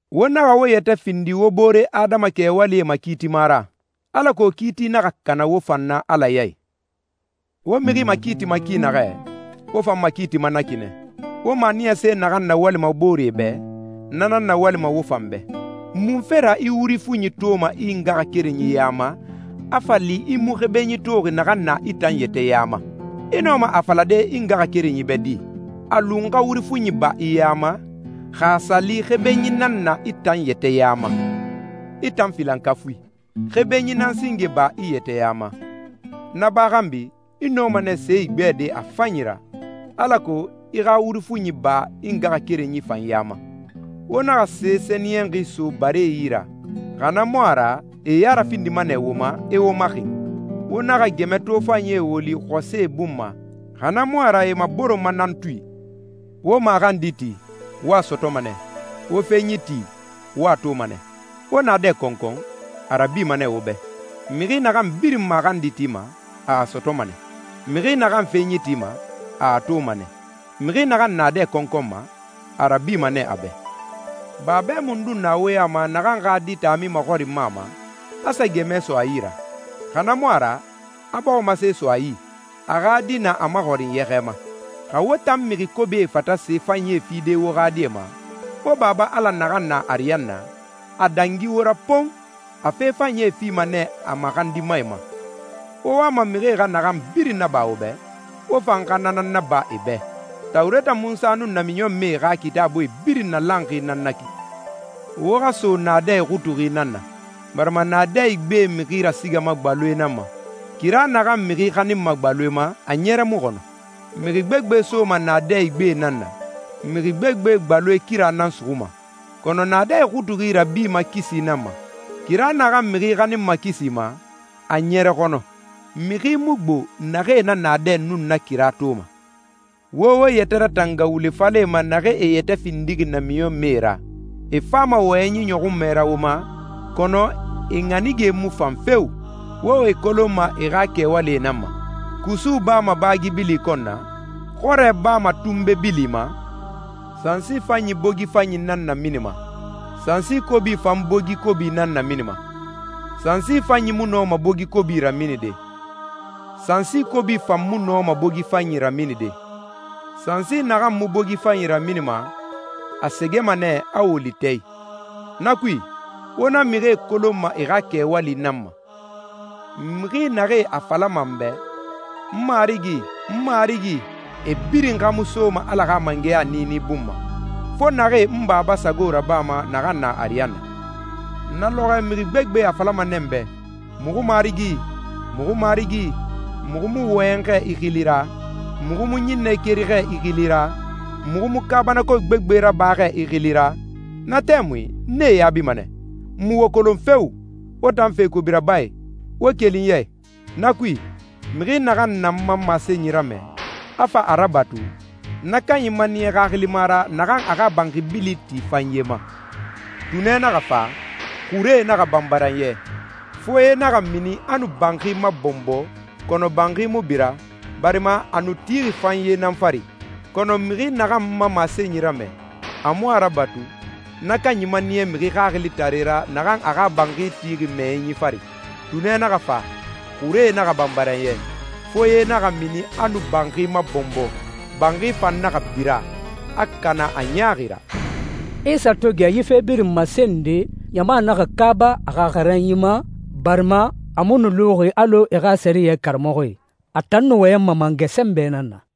«Wo naxa wo yɛtɛ findi wo boore adama kɛwalie makiitima ra, alako kiiti naxa kana wo fan na Ala yi. Wo mixi makiitima ki naxɛ, wo fan makiitima na ki nɛ. Wo maniyase naxan nawalima booree bɛ, na nan nawalima wo fan bɛ. Munfe ra i wuri fuɲi toma i ngaxakerenyi ya ma, a fa li i mu xebenyi toxi naxan na i tan yɛtɛ ya ma? I nɔma a falade i ngaxakerenyi bɛ di, ‹A lu n xa wuri fuɲi ba i ya ma,› xa a sa li xebenyi nan na i tan yɛtɛ ya ma? I tan filankafui, xebenyi nan singe ba i yɛtɛ ya ma. Na ba xanbi, i nɔma nɛ se igbɛde a fanyi ra, alako i xa wuri fuɲi ba i ngaxakerenyi fan ya ma.» «Wo naxa se sɛniyɛnxi so baree yi ra, xa na mu a ra e e ya rafindima nɛ wo ma, e wo maxin. Wo naxa gɛmɛ tofanyie woli xɔsɛe bun ma, xa na mu a ra e e maboronma nan tui.» «Wo maxandi ti, wo a sɔtɔma nɛ. Wo fenyi ti, wo a toma nɛ. Wo naadɛ kɔnkɔn, a rabima nɛ wo bɛ. Mixi naxan birin maxandi tima, a a sɔtɔma nɛ. Mixi naxan fenyi tima, a a toma nɛ. Mixi naxan naadɛ kɔnkɔnma, a rabima nɛ a bɛ.» «Babɛ mundun na wo ya ma naxan xa di taami maxɔrinma a ma, a sa gɛmɛ so a yi ra? Xa na mu a ra, a bɔximase so a yi, a xa di na a maxɔrin yɛxɛ ma? Xa wo tan mixi kobie fata se fanyie fide wo xa die ma, wo Baba Ala naxan na ariyanna, a dangi wo ra pon! A fe fanyie fima nɛ a maxandimae ma.» «Wo wama mixie xa naxan birin naba wo bɛ, wo fan xa na nan naba e bɛ. Tawureta Munsa nun namiɲɔnmɛe xa Kitaabuie birin nalanxi nan na ki.» «Wo xa so naadɛ ixutuxi nan na, barima naadɛ igbe mixi rasigama gbaloe nan ma. Kira naxan mixi xaninma gbaloe ma, a ɲɛrɛ mu xɔnɔ. Mixi gbegbe soma naadɛ igbe nan na, mixi gbegbe gbaloe kira nan suxuma. Kɔnɔ naadɛ ixutuxi rabima kisi nan ma. Kira naxan mixi xaninma kisi ma, a ɲɛrɛ xɔnɔ. Mixi mu gbo naxee na naadɛ nun na kira toma.» «Wo wo yɛtɛ ratanga wule falɛe ma naxee e yɛtɛ findixi namiɲɔnmɛe ra. E fama wɔyɛnyi ɲɔxunmɛ ra wo ma, kɔnɔ e ɲanige mu fan feo! Wo e kolonma e xa kɛwali nan ma. Kusu bama baagi bili kɔn na? Xɔrɛ bama tunbe bili ma? Sansi fanyi bogi fanyi nan naminima, sansi kobi fan bogi kobi nan naminima. Sansi fanyi mu nɔma bogi kobi raminide, sansi kobi fan mu nɔma bogi fanyi raminide. Sansi naxan mu bogi fanyi raminima, a sɛgɛma nɛ, a woli tɛ i. Na kui, wo na mixie kolonma e xa kɛwali nan ma.» «Mixi naxee a falama n bɛ, ‹N Marigi, n Marigi,› e birin xa mu soma Ala xa mangɛya niini bun ma, fo naxee n Baba sago rabama naxan na ariyanna. Na lɔxɔɛ mixi gbegbe a falama nɛ n bɛ, ‹Muxu Marigi, muxu Marigi, muxu mu wɔyɛn xɛ i xili ra? Muxu mu ɲinnɛe keri xɛ i xili ra? Muxu mu kaabanako gbegbe raba xɛ i xili ra?› Na tɛmui n nee yaabima nɛ, ‹N mu wo kolon feo! Wo tan fe kobi rabae, wo keli n ya i.›» «Na kui, mixi naxan na n ma masenyi ramɛ, a fa a rabatu, na kanyi maniya xaxilima ra naxan a xa banxi bili ti fanye ma. Tunɛ naxa fa, xuree naxa banbaran yɛ, foye naxa mini a nu banxi mabɔnbɔ, kɔnɔ banxi mu bira, barima a nu tixi fanye nan fari. Kɔnɔ mixi naxan n ma masenyi ramɛ, a mu a rabatu, na kanyi maniya mixi xaxilitare ra naxan a xa banxi tixi mɛyɛnyi fari. Tunɛ naxa fa, xuree naxa banbaran yɛ, foye naxa mini a nu banxi mabɔnbɔ, banxi fan naxa bira, a kana a ɲaaxi ra.» Isa to gɛ yi fe birin masende, ɲama naxa kaaba a xa xaranyi ma, barima a mu nu luxi alɔ e xa sɛriyɛ karamɔxɔe. A tan nu wɔyɛnma mangɛ sɛnbɛ nan na.